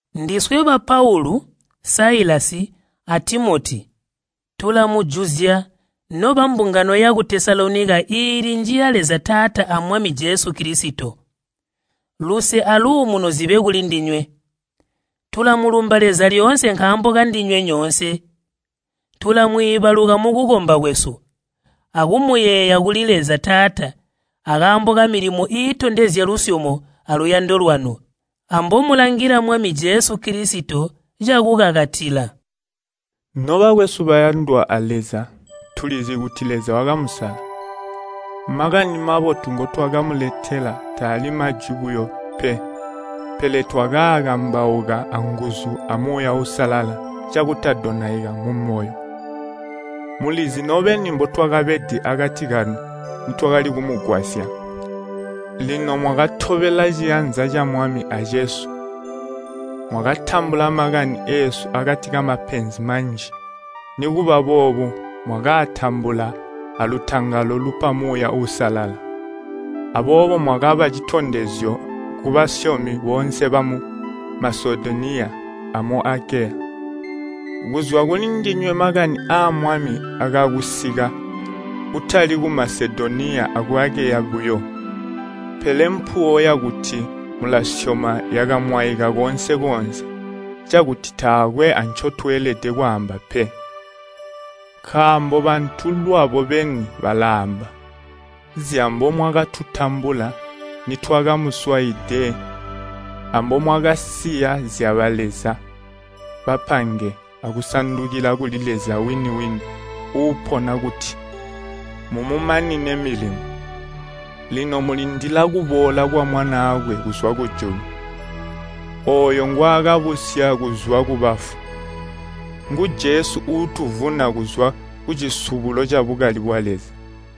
Ndiswe ba Paulu, Siluvano, a Timoti tulamujuzya nobambungano yaku Tesalonika iili njiya Leza Taata a Mwami Jesu Kilisito. Luse aluumuno zibe kulindinywe. Tulamulumba Leza lyoonse nkaambo kandinywe nyoonse. Tulamwiibaluka mukukomba kwesu, akumuyeeya kuli Leza Taata akaambo kamilimo iitondezya lusyomo aluyando lwanu, ambomulangila Mwami Jesu Kilisito cakukakatila. Nobakwesu bayandwa a Leza, tulizi kuti Leza wakamusala, Makani Mabotu ngotwakamuletela taali majwi buyo pe. Pele twakaakambauka anguzu amu Muuya Uusalala cakutadonaika mumoyo. Mulizi nobeni mbotwakabede akati kanu nitwakali kumugwasya. Lino mwakatobela ciyanza ca Mwami acesu. Mwakatambula makani eesu akati kamapenzi manji, nikuba boobo mwakaatambula alutangalo lupa Muuya Uusalala. Aboobo mwakaba citondezyo kubasyomi boonse bamu Masedoniya amu Akeya. Kuzwa kulindinywe makani aa Mwami akaakusika kutali ku Masedoniya aku Akeya buyo, pele mpuwo yakuti mulasyoma yakamwaika koonse-koonse, cakuti taakwe ancotweelede kwaamba pe. Nkaambo bantu lwabo beni balaamba zyambomwakatutambula nitwakamuswaide ambomwakasiya zyabaleza bapange akusandukila kuli Leza wini-wini uupona kuti mumumanine milimo. Lino mulindila kuboola kwa Mwanaakwe kuzwa kujulu, ooyo ngwaakabusya kuzwa kubafu. Ngu Jesu uutuvuna kuzwa kucisubulo cabukali bwa Leza.